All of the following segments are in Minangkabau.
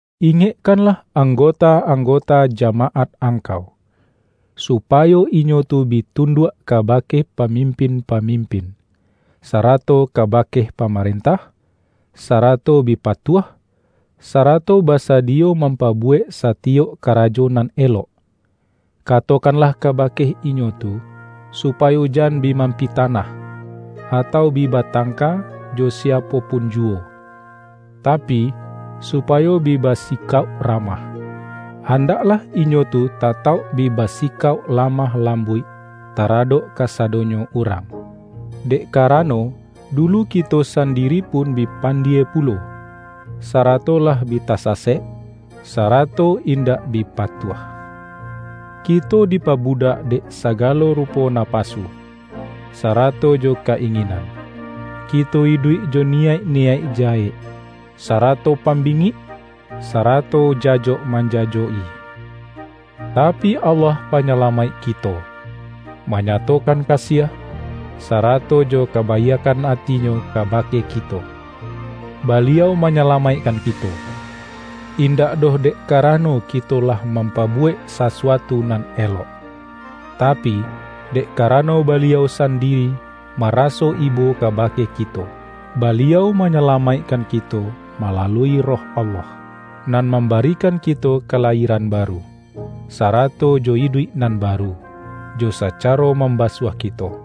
Ingekkanlah anggota-anggota ja-maat angkau, supayo inyo tu bi tunduak kabake pamimpin-pamim-pin, sarato kabake pamarentah, sara-to bi patuah, sarato basadiyo mam-pabuwek satiyok karajo nan elok. Katokanlah kabake inyo tu, supayo jan bi mampitanah, atau bi batangka jo siapo pun juwo, tapi, supayo bi ba-sikauk ramah. Andaklah inyo tu ta-tauk bi basikauk lamah lambuik tara-dok kasadonyo urang. Dek karano, dulu kito sandiri pun bi pandie pu-lo, sarato lah bi tasasek, sarato indak bi patuah. Kito dipabudak dek saga-lo rupo napasu, sarato jo ka-inginan; kito iduik jo niyaik-niyaik jahek, sa-rato pambingik, sarato jajok manja-jok-i. Tapi Allah Panyalamaik kito, manyatokan kasiah, sarato jo kaba-iakkan ati-Nyo kabake kito. Baliau manyalamaikkan kito, indak doh dek karano kito lah mampabuwek sasuatu nan elok, tapi, dek karano Baliau san-diri maraso ibo kabake kito. Baliau manyalamaikkan kito malalui Roh Allah, nan mambarikan kito kalayie-ran baru, sarato jo iduik nan baru, jo sacaro mambasuah kito.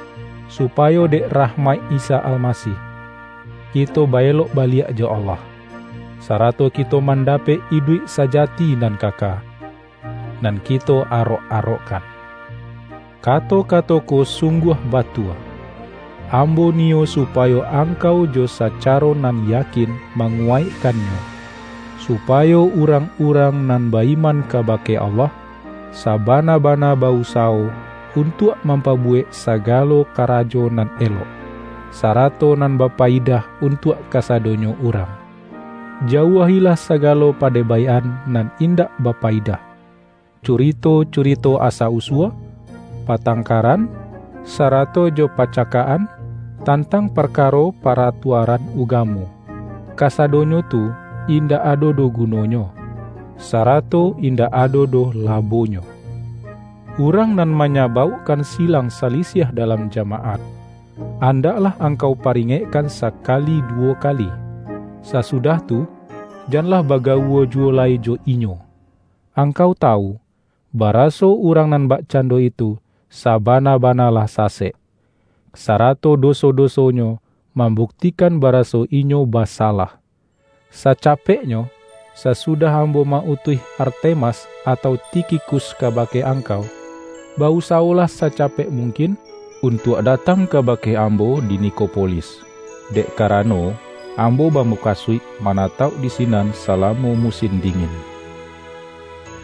supayo dek rahmaik Isa Almasih, kito ba-elok baliak jo Allah, sarato kito mandapek iduik sajati nan kaka, nan kito arok-arokkan. Kato-kato ko sungguah batua. Ambo niyo supayo angkau jo sacaro nan yakin manguwaikkannyo, supa-yo urang-urang nan ba-iman kabake Allah, sabana-bana ba-usawo untuak mampabuwek sagalo kara jo nan elok, sarato nan bapayidah untuak kasado-nyo urang. Jauah-ilah sagalo pade-baik-an nan indak bapayidah, curito-curito asa-usua, patangkaran, sarato jo pacakak-an, tantang parkaro pa-ratuaran ugamo. Kasadonyo tu in-dak ado doh gunonyo, sarato indak ado doh labonyo. Urang nan ma-nyabaukkan silang salisiah dalam ja-maat, andaklah angkau paringekkan sakali duwo kali; sasudah tu, janlah bagawua juwo lai jo inyo. Angkau tawu, baraso urang nan bakcando itu sabana-bana lah sasek, sarato doso-dosonyo mambuktikan baraso inyo basalah. Sacapeknyo, sasudah ambo ma-utuih Artemas atau Tikhikus kabake angkau, ba-usawolah sacapek mung-kin untuak datang kabake ambo di Nikopolis, dek karano, ambo bamu-kasuik manatauk di sinan salamo mu-sin dingin.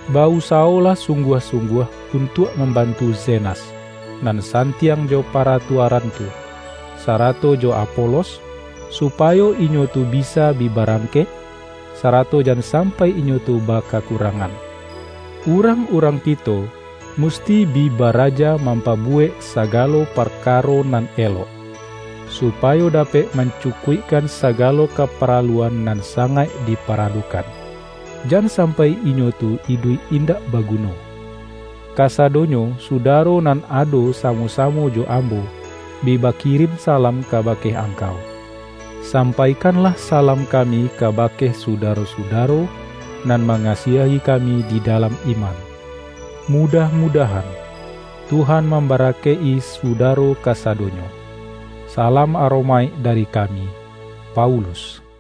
Ba-usawolah sungguah-sungguah untuak mambantu Zenas, nan santiang jo paratuaran tu, sara-to jo Apolos, supayo inyo tu bisa bi barangkek, sarato jan sampai inyo tu bakakurangan. Urang-urang kito musti bi baraja mampabuwek sagalo parkaro nan elok, supayo dapek man-cukuikkan sagalo kaparaluan nan sa-ngaik diparalukan; jan sampai inyo tu iduik indak baguno. Kasadonyo sudaro nan ado sa-mo-samo jo ambo, bi bakirin salam kabake angkau. Sampaikanlah salam kami kabake sudaro-sudaro nan ma-ngasiahi kami di dalam iman. Mudah-mudahan, Tuhan mambara-kaik-i sudaro kasadonyo. Salam aromaik dari kami, Paulus